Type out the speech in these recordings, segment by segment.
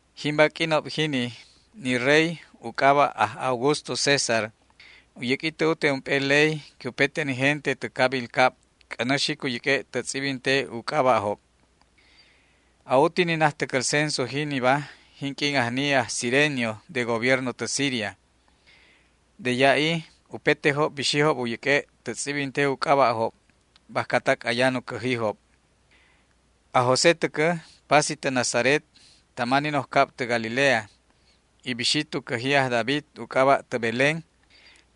Jimba q'uinob jini ni rey u c'aba' aj Augusto César u yäq'ui tä ute ump'e ley que upete ni gente tä cabil cab c'änä xic u yäq'ue' tä tz'ibinte u c'aba'job. A'uti ni najtäcäl censo jiniba jinq'uin ajni aj Cirenio de gobierno tä Siria. De ya'i upetejob bixijob u yäq'ue' tä tz'ibinte u c'aba'job bajcatac ayan u cäjijob. Aj José täcä pasi tä Nazaret tama ni noj cab tä Galilea y bixi tu cäji aj David u c'aba' tä Belén,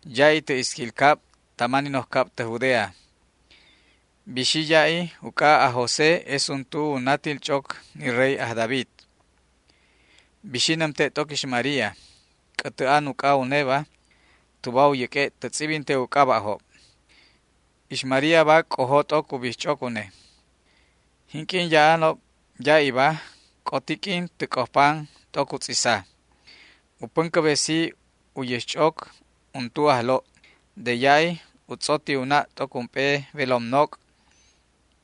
ya'i tä isquil cab tama ni noj cab tä Judea. Bixi ya'i uc'a aj José es untu u natil ch'oc ni rey aj David. Bixi nämte' t'oc ix María, c'ätä an uc'a uneba, tuba u yäq'ue' tä tz'ibinte u c'aba'job. Ix Maríaba c'ojo t'oc u bijch'oc une. Jinq'uin ya'anob ya'iba c'oti q'uin tä c'ojpan t'oc u tz'isa. U päncäbesi u yäxch'oc, untu ajlo'. De ya'i u tz'oti u na' t'oc ump'e welom noc',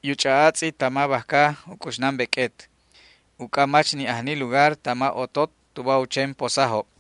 y u ch'a'atz'i tama bajca u c'uxnan beq'uet, uc'a mach ni' ajni lugar tama otot tuba u chen posajob.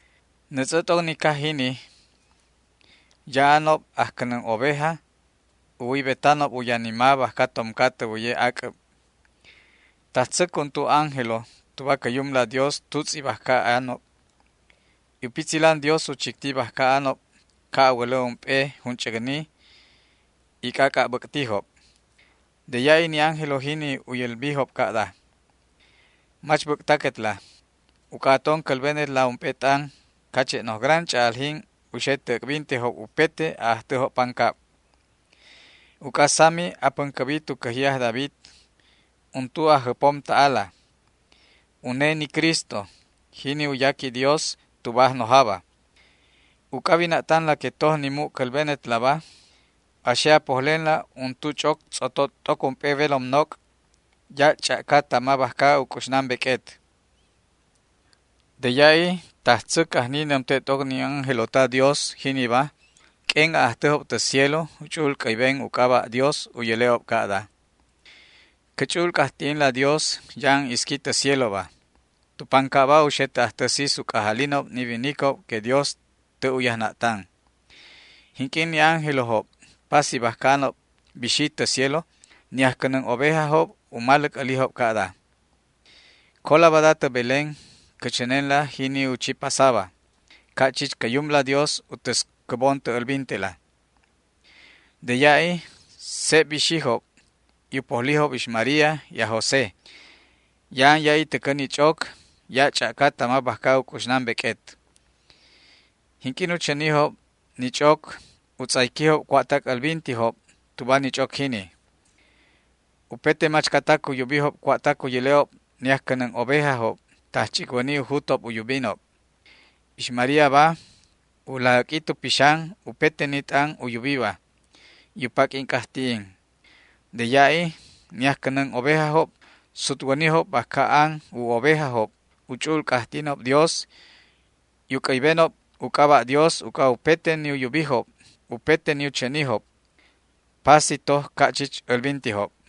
Nätz'ä t'oc ni caj jini ya'anob ajcänän oveja u wäybetanob u yanima bajca tomca tä wäye ac'äb. Tajtzäc untu ángelo tuba cä Yumla Dios tutz'i bajca anob, y u pitzilan Dios u chicti bajca anob ca' a wälä ump'e junch'äcni, y c'ac'a' bäc'tijob. De ya'i ni ángelo jini u yälbijob ca'da: ―Mach bäc'taquetla uc'a aton cälbenetla ump'e t'an cache' noj gran ch'a'aljin u xe tä äc'bintejob upete a'ajtäjob pancab. Uc'a sami apäncäbi tu cäji aj David untu Ajjäpom ta'ala. Une ni Cristo, jini u yaqui Dios tuba Ajnojaba. Uc'a a wina'tanla que toj ni mu' cälbenetlaba, a xe a pojlenla untu ch'oc tz'oto t'oc ump'e welom noc' ya' ch'a'ca tama bajca u c'uxnan beq'uet. De ya'i tajtzäc ajni nämte' t'oc ni ángelo ta Dios jiniba q'uen a'ajtäjob tä cielo u ch'u'ul c'äyben u c'aba' Dios u yäle'ob ca'da: ¡Cä ch'u'ul c'ajti'inla Dios ya'an isqui tä cieloba; tu pancabba u xe tä ajtä sis u c'ajalinob ni winicob que Dios tä' u yajna'tan! Jinq'uin ni ángelojob pasi bajca anob bixijob tä cielo, ni ajcänän ovejajob u maläc älijob ca'da: ―Cola bada tä Belén cä chänenla jini u chi pasaba, ca' chich cä Yumla Dios u täscäbon tä älbintela. De ya'i seb bixijob y u pojlijob ix María y aj José. Ya'an ya'i täcä ni ch'oc ya' ch'a'ca tama bajca u c'uxnan beq'uet. Jinq'uin u chänijob ni ch'oc u tz'ayquijob cua'tac älbintijob tuba ni ch'oc jini. Upete machcatac u yubijob cua'tac u yäle'ob ni ajcänän ovejajob, tajch'icwäni u jut u yubinob. Ix Maríaba u laj äq'ui tu pixan upete ni t'an u yubiba, y u paq'uin c'ajti'in. De ya'i ni ajcänän ovejajob sutwänijob bajca an u ovejajob u ch'u'ul c'ajti'inob Dios y u c'äybenob u c'aba' Dios uc'a upete ni u yubijob, upete ni u chänijob. Pasi toj ca' chich älbintijob.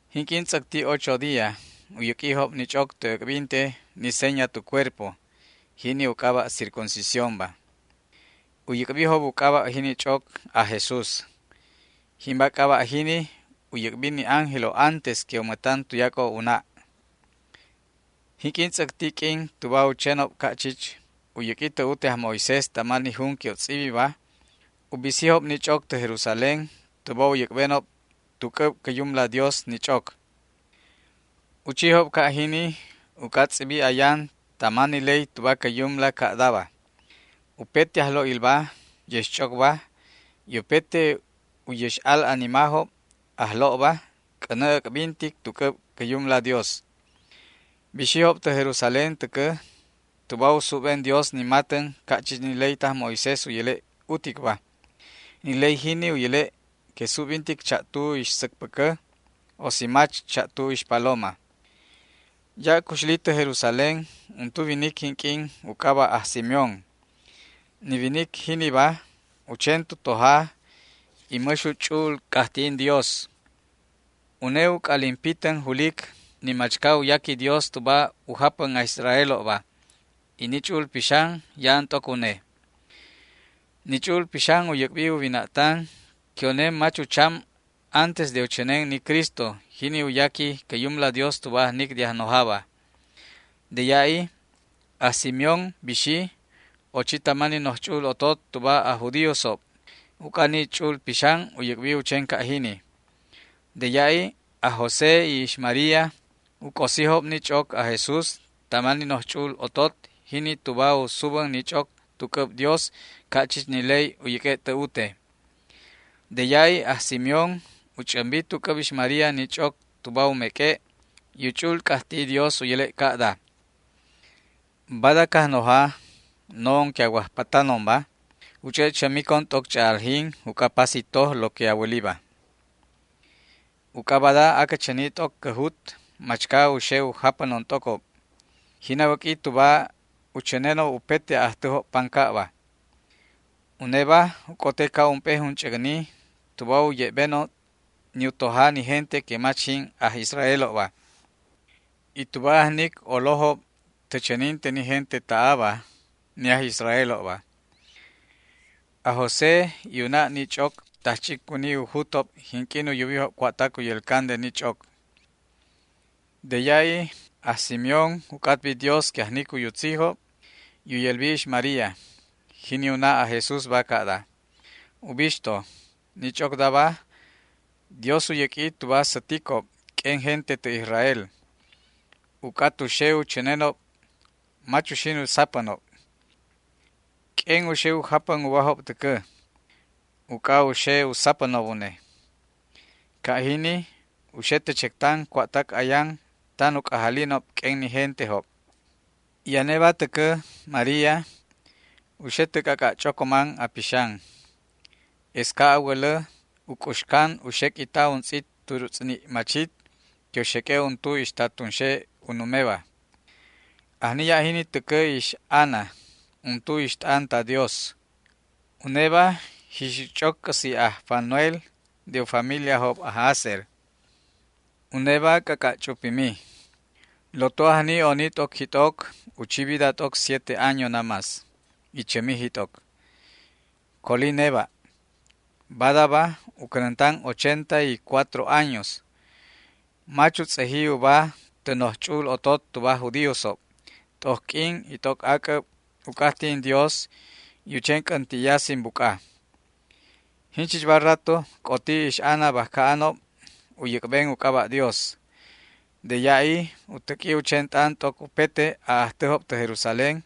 Jinq'uin tz'äcti ocho día u yäq'uijob ni ch'oc tä äc'binte ni seña tu cuerpo, jini u c'aba' circuncisiónba. U yäc'bijob u c'aba' jini ch'oc, aj Jesús. Jimba c'aba' jini u yäc'bi ni ángelo antes que u mätan tuyac'o u na'. Jinq'uin tz'äcti q'uin tuba u chenob ca' chich u yäq'ui tä ute aj Moisés tama ni jun que u tz'ibiba, u bisijob ni ch'oc tä Jerusalén tuba u yäc'benob tu c'äb cä Yumla Dios ni ch'oc. U chijob ca' jini uc'a tz'ibi ayan tama ni ley tuba cä Yumla ca'daba: “Upete ajlo'ilba yäx ch'ocba y upete u yäx al animajob ajlo'ba, c'änä äc'bintic tu c'äb cä Yumla Dios”. Bixijob tä Jerusalén täcä tuba u subben Dios ni matän ca' chich ni ley taj Moisés u yäle' uticba. Ni ley jini u yäle' que subbintic cha'tu ixsäcpäcä, o si mach, cha'tu ixpaloma. Ya' cuxli tä Jerusalén untu winic jinq'uin u c'aba' aj Simeón. Ni winic jiniba u chen tu toja y mäx u ch'u'ul c'ajti'in Dios. Une u c'alin pitän julic ni machca u yaqui Dios tuba u japän aj Israelobba, y ni Ch'u'ul Pixan ya'an t'oc une. Ni Ch'u'ul Pixan u yäc'bi u wina'tan que une mach ucham antes de u chänen ni Cristo, jini u yaqui cä Yumla Dios tuba ajnic de Ajnojaba. De ya'i aj Simeón bixi, ochi tama ni noj ch'u'ul otot tuba aj judíosob, uc'a ni Ch'u'ul Pixan u yäc'bi u chen ca' jini. De ya'i aj José y ix María u c'osijob ni ch'oc aj Jesús tama ni noj ch'u'ul otot jini tuba u subän ni ch'oc tu c'äb Dios ca' chich ni ley u yäq'ue' tä ute. De ya'i aj Simeón u ch'ämbi tu c'äb ix María ni ch'oc tuba u meq'ue', y u ch'u'ul c'ajti'i Dios u yäle' ca'daba: Bada Cajnoja, no'on que a wajpatanonba, u ch'e' chämicon t'oc ch'a'aljin uc'a pasi toj lo que a wäliba. Uc'a bada acä chäni t'oc cä jut machca u xe u japänon t'ocob, jin a wäq'ui tuba u chänenob upete a'ajtäjob pancabba. Uneba u c'ote ca' ump'e junch'äcni tuba u ye'benob ni u toja ni gente que mach jin aj Israelob, y tuba ajnic olojob tä chäninte ni gente ta'aba, ni aj Israelobba. Aj José y u na' ni ch'oc tajch'icwäni u jutob jinq'uin u yubijob cua'tac u yälcan de ni ch'oc. De ya'i aj Simeón u c'atbi Dios que ajnic u yutzijob y u yälbi ix María, jini u na' aj Jesúsba, ca'da: ―Ubixto, ni ch'ocdaba Dios u yäq'ui tuba säticob q'uen gente tä Israel, uc'a tu xe u chänenob mach uxin u sapänob. Q'uen u xe u japän ubajob täcä, uc'a u xe u sapänob une. Ca' jini u xe tä chectan cua'tac ayan tan u c'ajalinob q'uen ni gentejob. Y aneba täcä, María, u xe tä c'ac'a' ch'ocoman a pixan. Es ca' a wälä u c'uxcan u xeq'uita untz'it turutz'ni' machit que u xeq'ue' untu ixta tunxe u numeba. Ajni ya' jini täcä ix Ana, untu ixt'an ta Dios. Uneba jixic ch'oc c'äsi' aj Fanuel de u familiajob aj Aser. Uneba ac'ac'a' ch'upimi. Loto ajni oni t'oc jit'oc u chi vida t'oc siete años namás, y chämi jit'oc. Coli neba'. Badaba u cänäntan ochenta y cuatro años. Mach u tz'eji uba tä noj ch'u'ul otot tuba aj judíosob. T'oc q'uin y t'oc ac'äb u c'ajti'in Dios y u chen c'änti'ya sin buc'a. Jinchichba rato c'oti ix Ana bajca anob u yäc'ben u c'aba' Dios. De ya'i u täq'ui u chen t'an t'oc upete a'ajtäjob tä Jerusalén,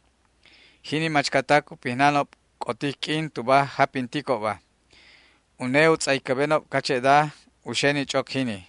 jini machcatac u pijnanjob c'otic q'uin tuba japinticobba. Une u tz'aycäbenob cache'da u xe ni ch'oc jini.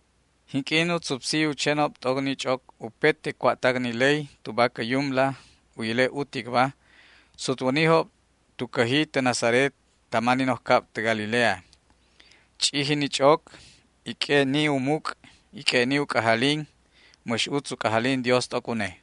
Jinq'uin u tzupsi u chenob t'oc ni ch'oc upete cua'tac ni ley tuba cä Yumla u yäle' uticba, sutwänijob tu cäji tä Nazaret tama ni noj cab tä Galilea. Ch'iji ni ch'oc y q'ue'ni u muc' y q'ue'ni u c'ajalin. Mäx utz u c'ajalin Dios t'oc une.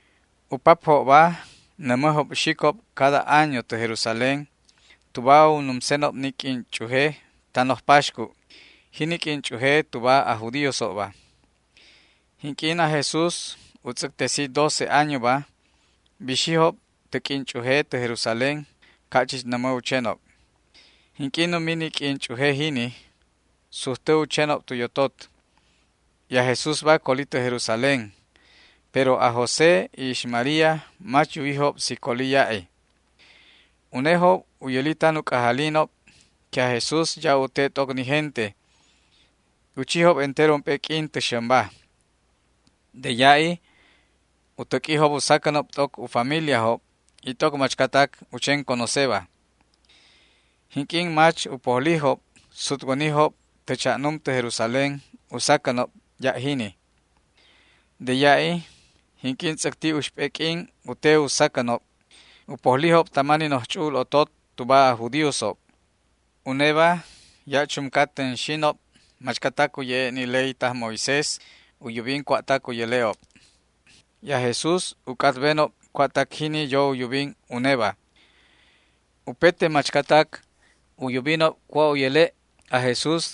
U papjobba nämäjob xicob cada año tä Jerusalén tuba u numsenob ni q'uin ch'uje ta noj paxcu', jini q'uin ch'uje tuba aj judíosobba. Jinq'uin aj Jesús u tz'äctesi doce añoba bixijob tä q'uin ch'uje tä Jerusalén ca' chich nämä u chenob. Jinq'uin numi ni q'uin ch'uje jini, sujtä u chenob tu yotot, y aj Jesúsba coli tä Jerusalén, pero aj José y ix María mach yuwijob si coli ya'i. Unejob u yäli tan u c'ajalinob que aj Jesús ya' u te t'oc ni gente, y u chijob entero ump'e q'uin tä xämba. De ya'i u täq'uijob u sacänob t'oc u familiajob y t'oc machcatac u chen conoceba. Jinq'uin mach u pojlijob, sutwänijob tä cha'num tä Jerusalén u sacänob ya' jini. De ya'i, jinq'uin tz'äcti uxp'e q'uin u te u sacänob, u pojlijob tama ni noj ch'u'ul otot tuba aj judíosob. Uneba ya' chumca tänxinob machcatac u ye'e' ni ley taj Moisés u yubin cua'tac u yäle'ob, y aj Jesús u c'atbenob cua'tac jini yo u yubin uneba. Upete machcatac u yubijob cua' u yäle' aj Jesús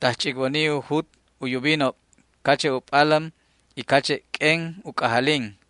tajch'icwäni u jut u yubinob cache' u p'alän y cache' q'uen u c'ajalin.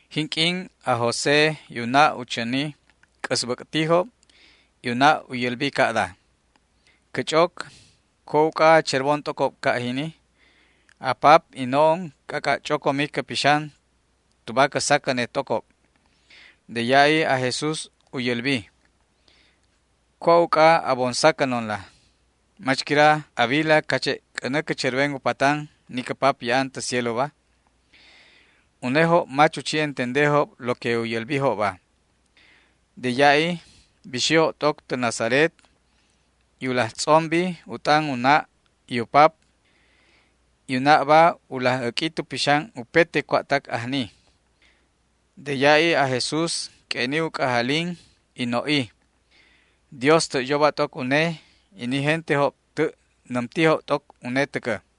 Jinq'uin aj José y u na' u chäni, c'äsbäc'tijob, y u na' u yälbi ca'da: ―Cä ch'oc, ¿cua' uc'a a cherbon t'ocob ca' jini? A pap y no'on c'ac'a' ch'ocomi cä pixan tuba cä sacänet t'ocob. De ya'i aj Jesús u yälbi: ―¿Cua' uc'a a bon saconla? ¿Mach quira a wila cache' c'änä cä cherben u patan ni cä Pap ya'an tä cieloba? Unejob mach u chi entendejob lo que u yälbijobba. De ya'i bixijob t'oc tä Nazaret, y u laj tz'ombi u t'an u na' y u pap. U na'ba u laj äq'ui tu pixan upete cua'tac ajni. De ya'i aj Jesús q'ue'ni u c'ajalin y no'i. Dios tä' yoba t'oc une y ni gentejob tä' nämtijob t'oc une täcä.